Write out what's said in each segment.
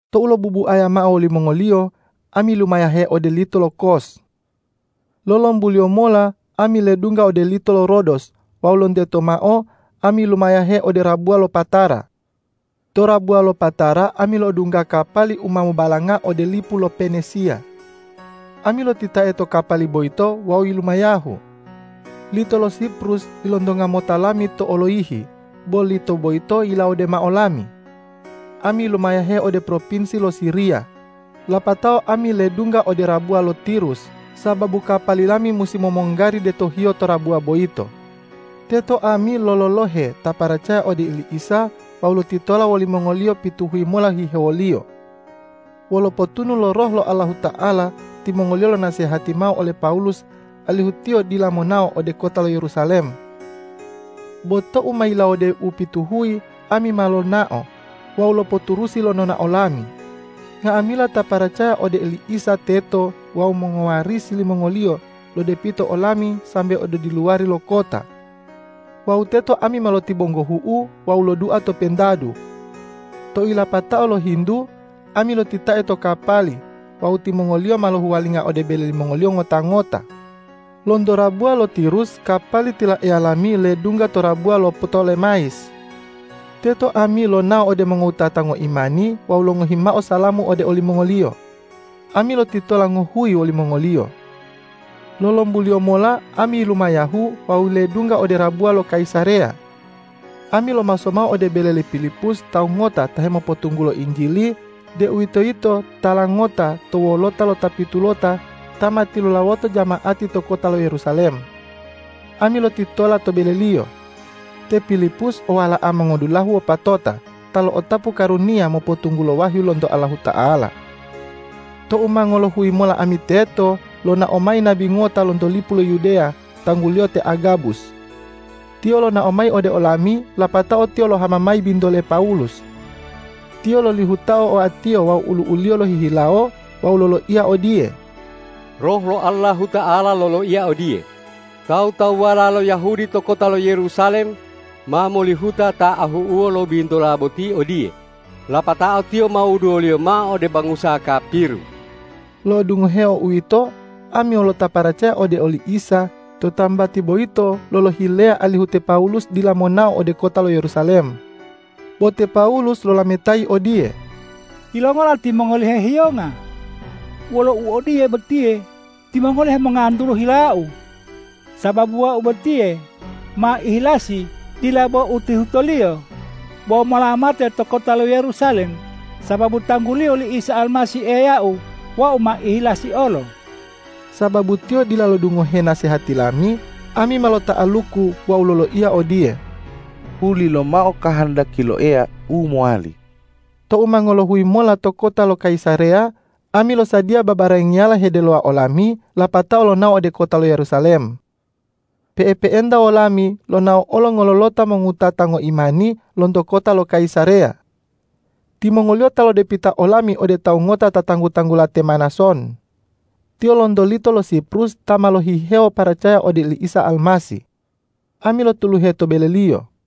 Tou lobubuaya mao wolimongoliyo, ami yilumayahe ode lito lo Kos. Lolombuliyo mola ami ledungga ode lito lo Rodos wawu lonteto mao ami yilumayahe ode rabuwa lo Patara. To rabuwa lo Patara ami lo'odungga kapali u ma mobalanga ode lipu lo Penisiya. Ami lotitae to kapali boyito wawu yilumayahu. Lito lo Siprus ilontonga mota lami to oloyihi, bo lito boyito yilawode mao lami. Ami yilumayahe ode propinsi lo Siriya. Lapatao ami ledungga ode rabuwa lo Tirus, sababu kapali lami musi momonggari detohiyo to rabuwa boyito. Teto ami lololohe ta paracaya ode oli Isa wawu lotitola wolimongoliyo pituhuyi mola hihewoliyo. Wolo potunu lo Roh lo Allahuta'ala timongoliyo lonasehati mao ole Pawulus alihu tiyo dila monao ode kota lo Yerusalem. Bo tou ma yilawode upituhuyi, ami ma lonao wawu lopoturusi lo nonao lami. Nga'amila ta paracaya ode oli Isa teto wawu mongowarisi limongoliyo lodepita olami sambe ode diluwari lo kota. Wawu teto ami ma lotibonggohu'u wawu lodua to pentadu. Tou yilapatao lohintu, ami lotitae to kapali wawu timongoliyo ma lohuwalinga ode bele limongoliyo ngota-ngota. Lonto rabuwa lo Tirus kapali tilaeya lami ledungga to rabuwa lo Ptolemayis. Teto ami lonao ode mongowutata ngoimani wawu longohi mao salamu ode olimongoliyo. Ami lotitola ngohuyi wolimongoliyo. Lolombuliyo mola ami yilumayahu wawu ledungga ode rabuwa lo Kayisareya. Ami lomaso mao ode bele le Pilipus tawu ngota ta hemopotunggulo Injili, deuwitoyito tala ngota to wolota lo ta pitulota ta ma tilulawoto jama'ati to kota lo Yerusalem. Ami lotitola to beleliyo. Te Pilipus o wala'a mongodulahu wopatota ta lo'otapu karuniya mopotunggulo wahyu lonto Allahuta'ala. Tou ma ngolohuyi mola ami teto, lonao mayi nabi ngota lonto lipu lo Yudeya, tangguliyo te Agabus. Tiyo lonao mayi ode olami, lapatao tiyo lohama mayi bintole Pawulus. Tiyo lolihutao oatiyo wawu ulu'uliyo lohihilawo wawu loloiya odiye,”Roh lo Allahuta'ala loloiya odiye, ’Tawu-tawuwala lo Yahudi to kota lo Yerusalem ma molihuta ta ahu'uwo lo bintola boti odiye, lapatao tiyo ma wuduwoliyo mao ode bangusa kapiru.’” Lo'odungoheo uwito, ami wolo ta paracaya ode oli Isa to tambati boyito lolohileya alihu te Pawulus dila monao ode kota lo Yerusalem. Bo te Pawulus lolametayi odiye,”Yilongola timongoli hehiyonga? Wolo u odiye botiye, timongoli hemongantulu hilau. Sababu wau botiye ma ihilasi dila bo utihutoliyo, bo mola mate to kota lo Yerusalem sababu tangguliyo li Isa Almasih, Eyau wau ma ihilasi olo.” Sababu tiyo dila lodungohe nasehati lami, ami ma lota'aluku wawu loloiya odiye,”Hulilomao kahandaki lo Eya u mowali.” Tou ma ngolohuyi mola to kota lo Kayisareya, ami losadiya babarangiyala hedelowa olami lapatao lonao ode kota lo Yerusalem. Pe'epe'enta wolami lonao olo ngololota mongowutata ngoimani lonto kota lo Kayisareya. Timongoliyo ta lodepita olami ode tawu ngota ta tanggu-tanggula te Manason. Tiyo lonto lito lo Siprus ta ma lohihewo paracaya ode oli Isa Almasih. Ami lotuluhe to beleliyo.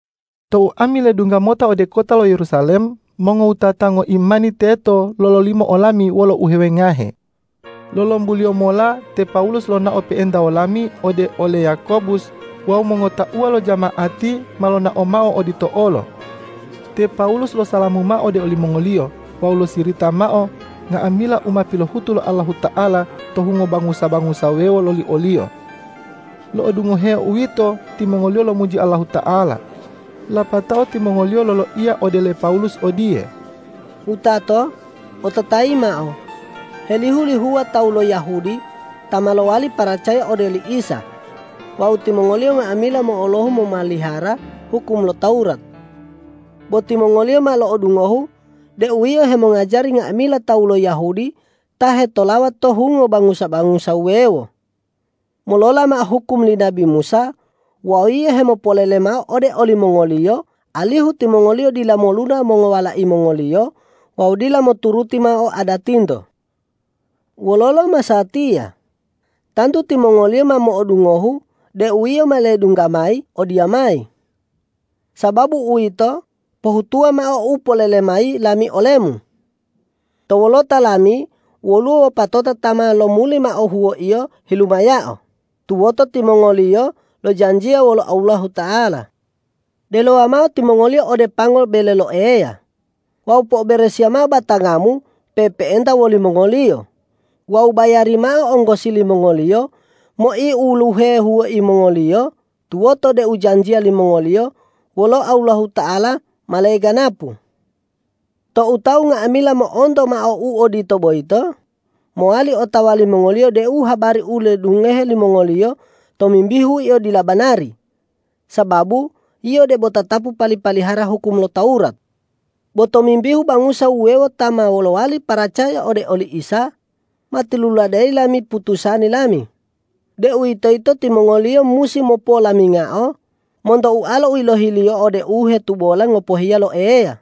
Tou ami ledungga mota ode kota lo Yerusalem, mongowutata ngoimani teto lololimo olami wolo uhewengahe. Lolombuliyo mola te Pawulus lonao pe'enta wolami ode ole Yakobus wawu mongotauwa lo jama'ati ma lonao mao odito olo. Te Pawulus losalamu mao ode olimongoliyo wawu losirita mao nga'amila u ma pilohutu lo Allahuta'ala to hungo bangusa-bangusa wuwewo loli oliyo. Lo'odungoheo uwito, timongoliyo lomuji Allahuta'ala. Lapatao timongoliyo loloiya ode le Pawulus odiye,”Wutato, ototayi mao: Helihu-lihuwa tawu lo Yahudi ta ma lowali paracaya ode oli Isa wawu timongoliyo nga'amila mo'olohu momalihara hukum lo Tawurat. Bo timongoliyo ma lo'odungohu deu yio hemongajari nga'amila tawu lo Yahudi ta hetolawa to hungo bangusa-bangusa wuwewo, molola mao hukum li nabi Musa wawu yio hemopolele mao ode olimongoliyo alihu timongoliyo dila moluna mongowalai mongoliyo wawu dila moturuti mao adatinto. Wololo masatiya? Tantu timongoliyo ma mo'odungohu deu yio ma ledungga mayi odiyamayi. Sababu uwito, pohutuwa mao u polele mayi lami olemu. To wolota lami woluwo wopatota ta ma lomuli mao huwoiyo hilumayao tuwoto timongoliyo lojanjiya wolo Allahuta'ala. Delowa mao timongoliyo ode pango bele lo Eya, wawu po'oberesiya mao batangamu pe'epe'enta wolimongoliyo wawu bayari mao onggosi limongoliyo moiuluhe huwoi mongoliyo tuwoto deu janjiya limongoliyo wolo Allahuta'ala ma leganapu. Tou tawu nga'amila mo'onto mao u odito boyito, mowali otawa limongoliyo deu habari u ilodungohe limongoliyo tomimbihu yio dila banari, sababu yio debo tatapu pali-palihara hukum lo Tawurat. Bo tomimbihu bangusa wuwewo ta ma lowali paracaya ode oli Isa, ma tiluladeyi lami putusani lami, deuwitoyito timongoliyo musi mopolamingao monto ualo u yilohiliyo ode u hetubola ngopohiya lo Eya,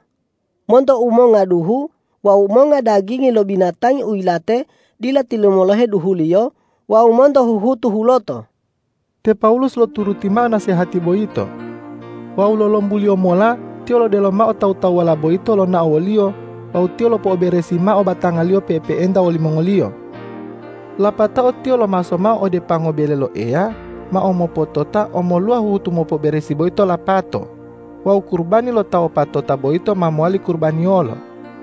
monto umonga duhu, wawu monga dagingi lo binatangi u yilate dila tilumolohe duhuliyo wawu monto huhutu huloto.” Te Pawulus loturuti mao nasehati boyito. Wawu lolombuliyo mola tiyo lodelo mao tawu-tawuwala boyito lonao woliyo wawu tiyo lopo'oberesi mao batangaliyo pe'epe'enta wolimongoliyo. Lapatao tiyo lomaso mao ode pango bele lo Eya mao mopotota omoluwa huhutu mopo'oberesi boyito lapato wawu kurubani lo ta wopatota boyito ma mowali kurubaniyolo.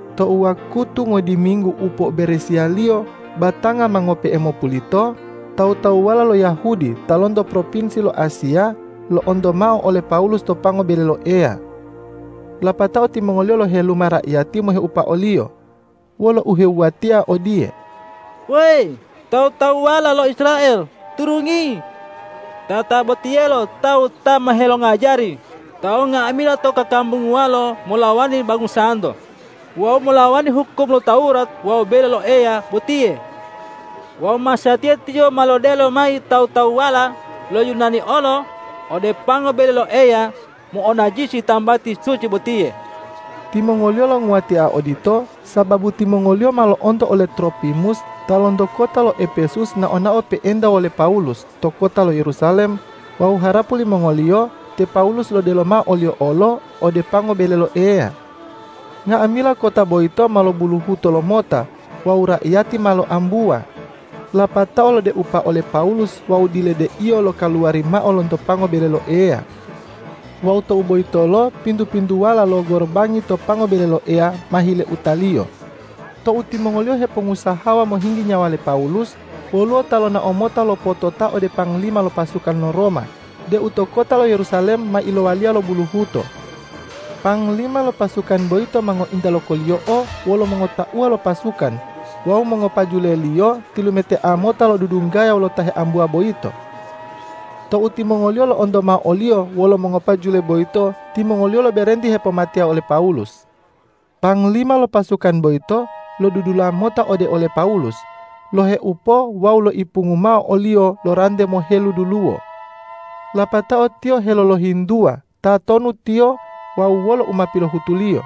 Tou wakutu ngodiminggu u po'oberesiyaliyo batanga ma ngope'e mopulito, tawu-tawuwala lo Yahudi ta lonto propinsi lo Asiya, lo'onto mao ole Pawulus to pango bele lo Eya. Lapatao timongoliyo loheluma raiyati moheupa oliyo wolo uhewuwatia odiye,”Weyi tawu-tawuwala lo Israel, turungi! Tatabotiyelo tawu ta ma helongajari tawu nga'amila to kakambunguwalo molawani bangusanto wawu molawani hukum lo Tawurat wawu bele lo Eya botiye! Wawu masatiya tiyo ma lodelo mayi tawu-tawuwala lo Yunani olo ode pango bele lo Eya mo'onajisi tambati suci botiye!” Timongoliyo longuwatia odito, sababu timongoliyo ma lo'onto ole Tropimus ta lonto kota lo Epesus nao-nao pe'enta wole Pawulus to kota lo Yerusalem wawu harapu limongoliyo te Pawulus lodelo mao oliyo olo ode pango bele lo Eya. Nga'amila kota boyito ma lobuluhuto lomota wawu raiyati ma loambuwa, lapatao lodeupa ole Pawulus wawu diledeiyo lokaluwari mao lonto pango bele lo Eya. Wawu tou boyitolo pintu-pintuwala lo gorobangi to pango bele lo Eya ma hileutaliyo. Tou timongoliyo hepongusahawa mohinggi nyawa le Pawulus, woluwo ta lonao mota lopotota ode panglima lo pasukan lo Roma deu to kota lo Yerusalem ma ilowaliya lo buluhuto. Panglima lo pasukan boyito ma ngointa lokoliyo'o wolo mongotauwa lo pasukan wawu mongopajuleliyo tilumetea mota lodudunggaya wolo ta heambuwa boyito. Tou timongoliyo lo'onto mao oliyo wolo mongopajule boyito, timongoliyo loberenti hepomateya ole Pawulus. Panglima lo pasukan boyito lodudula mota ode ole Pawulus, loheupo wawu loipungu mao oliyo lo rante moheluduluwo. Lapatao tiyo heloloyintuwa tatonu tiyo wawu wolo u ma pilohutuliyo.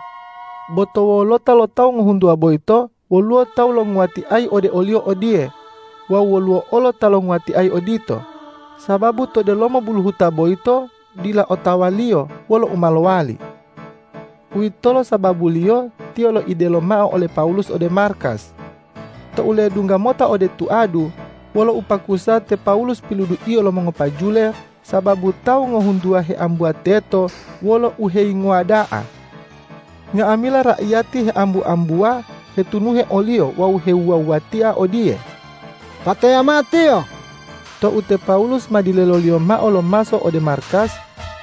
Bo to wolota lo tawu ngohuntuwa boyito, woluwo tawu longuwatiayi ode oliyo odiye wawu woluwo olo ta longuwatiayi odito, sababu to delomo buluhuta boyito dila otawaliyo wolo u ma lowali. Uwitolo sababuliyo tiyo loidelo mao ole Pawulus ode markas. Tou ledungga mota ode tuadu, wolo upakusa te Pawulus piluduiyo lo mongopajule sababu tawu ngohuntuwa heambuwa teto wolo uheyingowa da'a. Nga'amila raiyati heambu-ambuwa hetunuhe oliyo wawu hewuwa-wuwatia odiye,”Pateya mao tiyo!” Tou te Pawulus ma dileloliyo mao lomaso ode markas,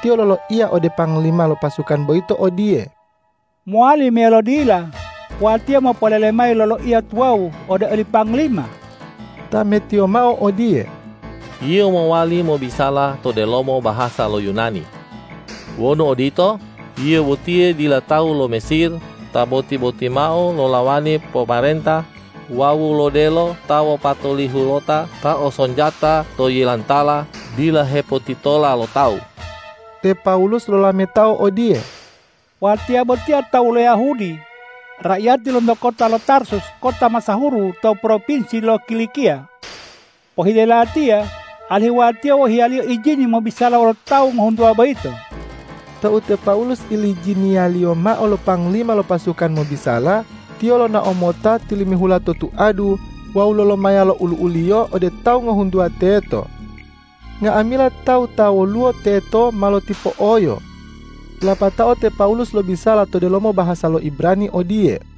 tiyo loloiya ode panglima lo pasukan boyito odiye,”Mowali meyalo dila watiya mopolele mayi loloiya tuwawu ode oli panglima?” Tametiyo mao odiye,”Yio mowali mobisala to delomo bahasa lo Yunani. Wonu odito, yio botiye dila tawu lo Mesir ta boti-botimao lolawani pomarenta wawu lodelo ta wopatolihulota ta o sonjata to yilantala dila hepotitola lo tawu.” Te Pawulus lolametao odiye,”Watiya botiya tawu lo Yahudi, raiyati lonto kota lo Tarsus kota masahuru to propinsi lo Kilikiya. Pohile latiya alihu watiya wohiyaliyo ijini mobisala wolo tawu ngohuntuwa boyito.” Tou te Pawulus ilijiniyaliyo mao lo panglima lo pasukan mobisala, tiyo lonao mota tilimihula to tuadu wawu lolomaya lo olu'uliyo ode tawu ngohuntuwa teto. Nga'amila tawu ta woluwo teto ma lotipo'oyo. Lapatao te Pawulus lobisala to delomo bahasa lo Ibrani odiye,